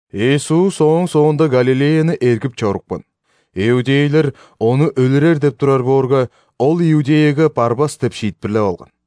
Иисус ооң соонда Галилеяны эргип чорупкан. Иудейлер Ону өлүрер деп турар боорга, Ол Иудеяга барбас деп шиитпирлеп алган.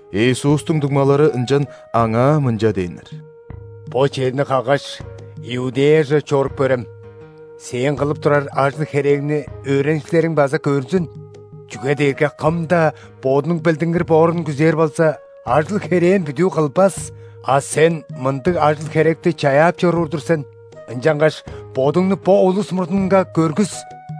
Иисустуң дуңмалары ынчан Аңаа мынча дээннер: «Бо черни каггаш, Иудеяже чоруп көрем! Сээң кылып турар ажыл-херээңни өөреникчилериң база көрзүн. Чүге дээрге кым-даа бодунуң билдингир боорун күзээр болза, ажыл-херээн бүдүү кылбас. А Сен мындыг ажыл-херекти чаяап чоруур-дур сен, ынчангаш Бодуңну бо улус мурнунга көргүс!»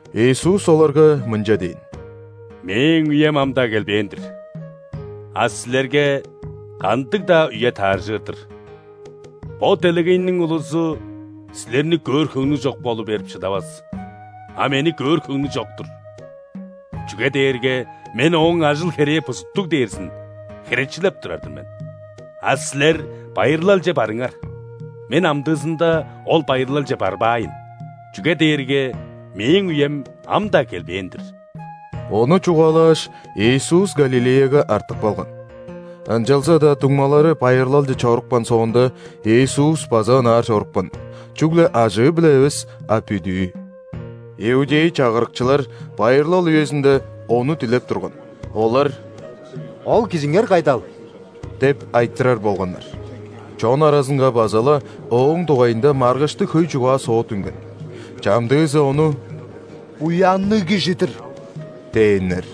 Иисус оларга мынча дээн: «Мээң үем ам-даа келбээн-дир. А силерге кандыг-даа үе тааржыр-дыр. Бо делегейниң улузу силерни көөр хөңнү чок болу берип шыдавас, а Мени көөр хөңнү чок-тур, чүге дээрге Мен ооң ажыл-херээ бузуттуг дээрзин херечилеп турар-дыр мен. А силер байырлалче барыңар. Мен амдыызында ол байырлалче барбаайн, чүге дээрге Мээң үем ам-даа келбээн-дир». Ону чугаалааш, Иисус Галилеяга артып калган. Ынчалза-даа дуңмалары байырлалче чорупкан соонда, Иисус база ынаар чорупкан, чүгле ажыы-биле эвес, а бүдүү. Иудей чагырыкчылар байырлал үезинде Ону дилеп турган. Олар: «Ол Кижиңер кайдал?» – деп айтырар болганнар. Чон аразынга база-ла Ооң дугайында маргыштыг хөй чугаа-соот үнген. Чамдыызы Ону: «Буянныг кижи-дир» – дээннер.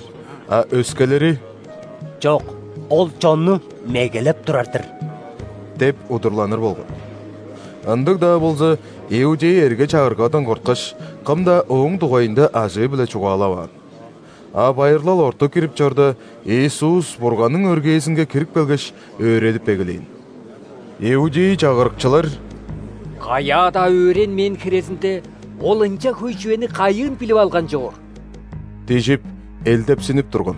А өскелери: «Чок, Ол чонну мегелеп турар-дыр» – деп удурланыр болган. Ындыг-даа болза, иудей эрге-чагыргадан корткаш, кым-даа Ооң дугайында ажыы-биле чугаалаваан. А байырлал орту кирип чорда, Иисус Бурганның өргээзинге кирип келгеш, өөредип эгелээн. Иудей чагырыкчылар: «Каяа-даа өөренмээн хирезинде, Ол ынча хөй чүвени кайыын билип алган чоор?» – дижип, элдепсинип турган.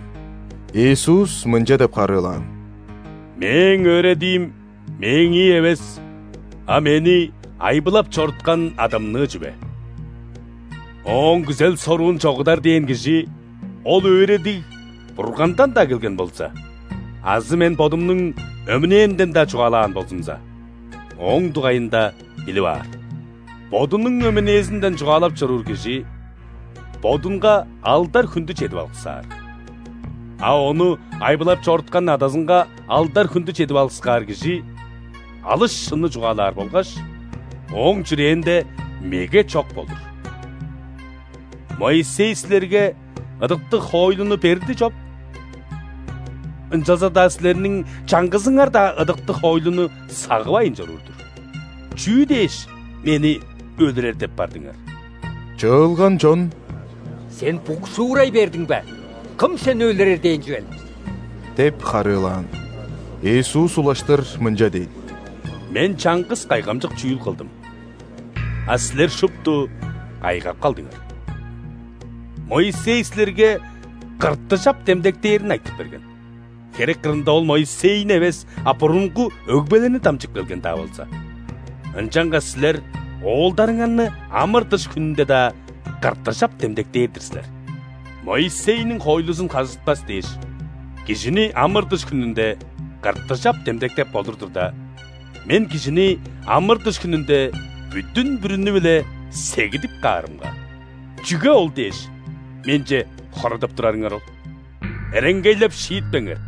Иисус мынча деп харыылаан: «Мээң өөредиим – Мээңии эвес, а Мени айбылап чоруткан Адамныы чүве. Ооң күзел-соруун чогудар дээн кижи, ол өөредиг Бургандан-даа келген болза азы Мен Бодумнуң өмүнээмден-даа чугаалаан болзумза, ооң дугайында билип аар. Бодунуң өмүнээзинден чугаалап чоруур кижи бодунга алдар-хүндү чедип алыксаар. А Ону айбылап чоруткан Адазынга алдар-хүндү чедип алыксаар Кижи алыс шынны чугаалаар болгаш, Ооң чүрээнде меге чок болур. Моисей силерге ыдыктыг хоойлуну берди чоп? Ынчалза-даа силерниң чаңгызыңар-даа ыдыктыг хоойлуну сагывайн чоруур-дур! Чүү дээш, мени өлүрер деп бардыңар?» Чыылган чон: «Сен букшуурай бердиң бе? Кым Сени өлүрер дээн чүвел?» – деп харыылаан. Иисус улаштыр мынча дээн: «Мен чаңгыс кайгамчык чүүл кылдым, а силер шупту кайгап калдыңар. Моисей силерге ·кыртыжап демдектээрин айтып берген (херек кырында ол Моисейни эвес, а бурунгу өгбелерни дамчып келген-даа болза), ынчангаш силер оолдарыңарны ·амыр-дыш хүнүнде-даа кыртыжап демдектээр-дир силер. Моисейниң хоойлузун хажытпас дээш, кижини амыр-дыш хүнүнде кыртыжап демдектеп болур турда, Мен кижини амыр-дыш хүнүнде бүдүн-бүрүнү-биле сегидип каарымга, чүге ол дээш, Менче хорадап турарыңар ол? Эреңгейлеп шиитпеңер,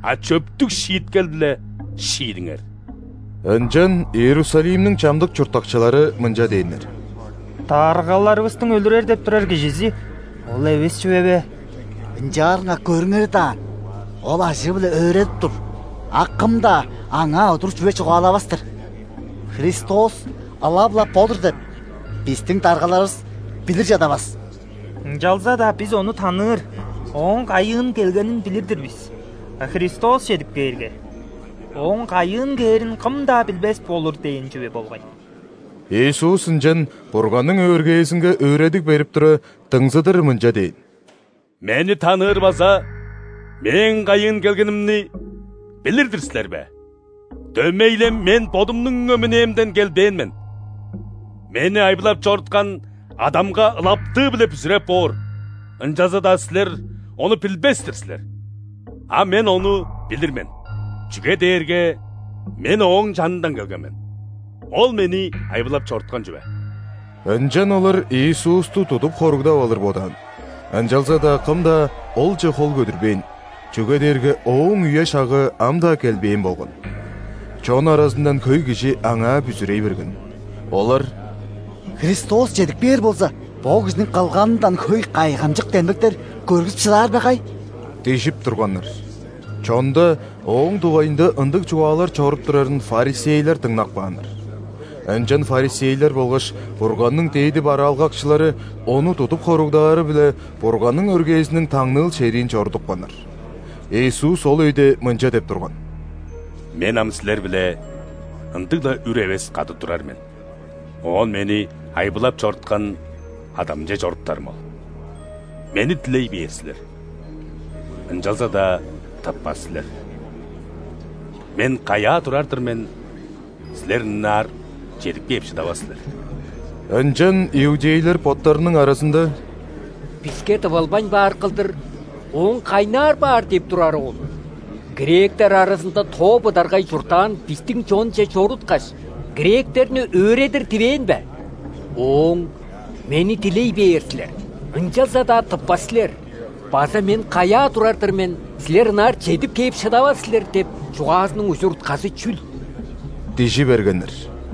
а чөптүг шииткел-биле шиидиңер». Ынчан Иерусалимниң чамдык чурттакчылары мынча дээннер: «Даргаларывыстың өлүрер деп турар кижизи Ол эвес чүве бе? Ынчаарга көрүңер даан, Ол ажыы-биле өөредип тур, а кым-даа Аңаа удур чүве чугаалавас-тыр. Христос ылап-ла Бо-дур деп, бистиң даргаларывыс билир чадавас. Ынчалза-даа бис Ону таныыр, Ооң кайыын келгенин билир-дир бис. А Христос чедип кээрге, Ооң кайыын кээрин кым-даа билбес болур дээн чүве болгай». Иисус ынчан Бурганның өргээзинге өөредиг берип тура, дыңзыдыр мынча дээн: «Мени таныыр база Мээң кайыын келгенимни билир-дир силер бе? Дөмей-ле Мен Бодумнуң өмүнээмден келбээн мен. Мени айбылап чоруткан Адамга ылаптыы-биле бүзүреп боор, ынчалза-даа силер Ону билбес-тир силер. А Мен Ону билир мен, чүге дээрге Мен Ооң чанындан келген мен. Ол Мени айбылап чоруткан чүве». Ынчан олар Иисусту тудуп хоругдап алыр бодаан, ынчалза-даа кым-даа Олче хол көдүрбээн, чүге дээрге Ооң үе-шагы ам-даа келбээн болган. Чон аразындан хөй кижи Аңаа бүзүрей берген. Олар: «Христос чедип кээр болза, бо кижиниң кылганындан хөй кайгамчык демдектер көргүзүп шыдаар бе кай?» – дижип турганнар. Чонда Ооң дугайында ындыг чугаалар чоруп турарын ·фарисейлер дыңнап кааннар. Ынчан фарисейлер болгаш Бурганның дээди бараалгакчылары Ону тудуп хоругдаары-биле Бурганның өргээзиниң таңныыл шериин чорудупканнар. Иисус ол өйде мынча деп турган: «Мен ам силер-биле ындыг-ла үр эвес кады турар мен, оон Мени айбылап чоруткан Адамче чоруптарым ол. Мени дилей бээр силер, ынчалза-даа тыппас силер. Мен каяа турар-дыр мен, силер ынаар чедип кээп шыдавас силер». Ынчан иудейлер боттарының аразында: «Биске тывылбайн баар кылдыр, Ооң кайнаар баар деп турары ол? Гректер аразында тоо быдаргай чурттаан бистиң чонче чоруткаш, гректерни өөредир дивээн бе? Ооң: „Мени дилей бээр силер, ынчалза-даа тыппас силер“ база „Мен каяа турар-дыр мен, силер ынаар чедип кээп шыдавас силер“ – деп чугаазының ужур-утказы чүл?» – дижи бергеннер.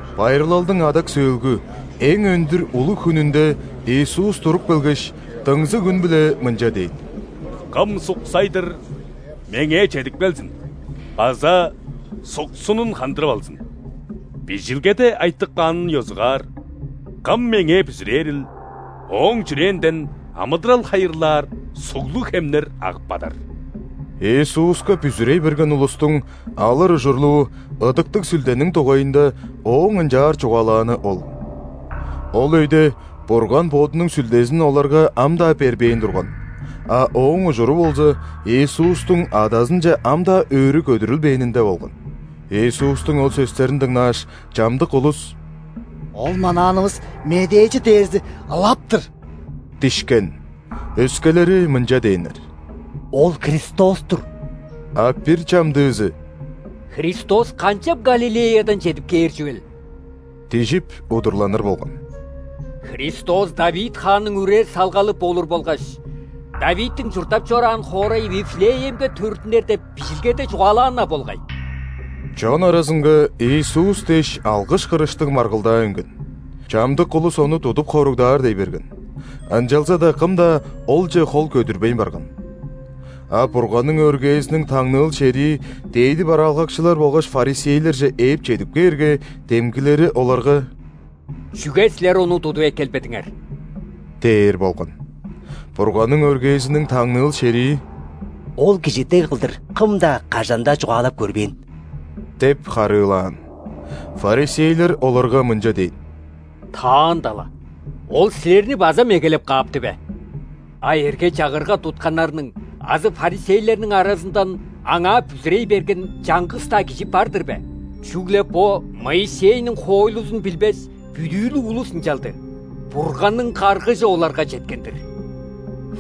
Байырлалдың адак сөөлгү, эң өндүр улуг хүнүнде Иисус туруп келгеш, дыңзыг үн-биле мынча дээн: «Кым суксай-дыр, Меңээ чедип келзин база суксунун хандырып алзын!. Бижилгеде айтып каанын ёзугаар, кым Меңээ бүзүрээрил, ооң чүрээнден амыдырал хайырлаар суглуг хемнер агып бадар». Иисуска бүзүрей берген улустуң алыр ужурлуу Ыдыктыг Сүлдениң дугайында Ооң ынчаар чугаалааны ол. Ол өйде Бурган Бодунуң Сүлдезин оларга ам-даа бербээн турган, а ооң ужуру болза, Иисустуң Адазынче ам-даа өрү көдүрүлбээнинде болган. Иисустуң ол сөстерин дыңнааш, чамдык улус: «Ол манаанывыс Медээчи дээрзи ылап-тыр!» – дишкен. Өскелери мынча дээннер: «Ол Христос-тур!» А бир чамдыызы: «Христос канчап Галилеядан чедип кээр чүвел? – дижип, удурланыр болган. – Христос ·Давид хаанның үре-салгалы болур болгаш Давидтиң чурттап чораан хоорайы Вифлеемге төрүттүнер деп Бижилгеде чугаалаан-на болгай». Чон аразынга Иисус дээш алгыш-кырыштыг маргылдаа үнген. Чамдык улус Ону тудуп хоругдаар дей берген, ынчалза-даа кым-даа Олче хол көдүрбейн барган. А Бурганның өргээзиниң таңныыл шерии дээди бараалгакчылар болгаш ·фарисейлерже ээп чедип кээрге, демгилери оларга: «Чүге силер Ону тудуп эккелбедиңер?» – дээр болган. Бурганның өргээзиниң таңныыл шерии: «Ол кижи дег кылдыр кым-даа, кажан-даа чугаалап көрбээн» – деп харыылаан. Фарисейлер оларга мынча дээн: «Таанда-ла, Ол силерни база мегелеп каапты бе? А эрге-чагырга тутканнарның азы фарисейлерниң аразындан Аңаа бүзүрей берген чаңгыс-даа кижи бар-дыр бе? Чүгле бо, Моисейниң хоойлузун билбес, бүдүүлүк улус ынчалды, Бурганның каргыжы оларга четкен-дир!»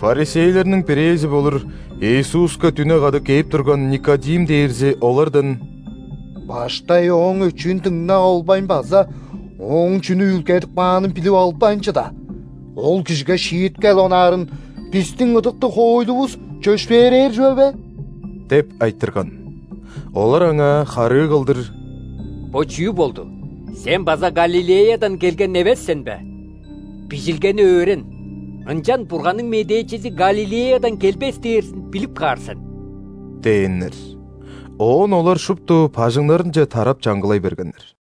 Фарисейлерниң бирээзи болур, Иисуска дүне када кээп турган Никодим дээрзи олардан: «Баштай ооң өчүүн дыңнап албайн база ооң чүнү үүлгедип каанын билип албайн чыда, ол кижиге шииткел онаарын бистиң ыдыктыг хоойлувус чөпшээрээр чүве бе?» – деп айтырган. Олар аңаа харыы кылдыр: «Бо чүү болду? Сен база Галилеядан келген эвес сен бе? Бижилгени өөрен, ынчан Бурганның медээчизи Галилеядан келбес дээрзин билип каар сен» – дээннер. [Оон олар шупту бажыңнарынче тарап чангылай бергеннер.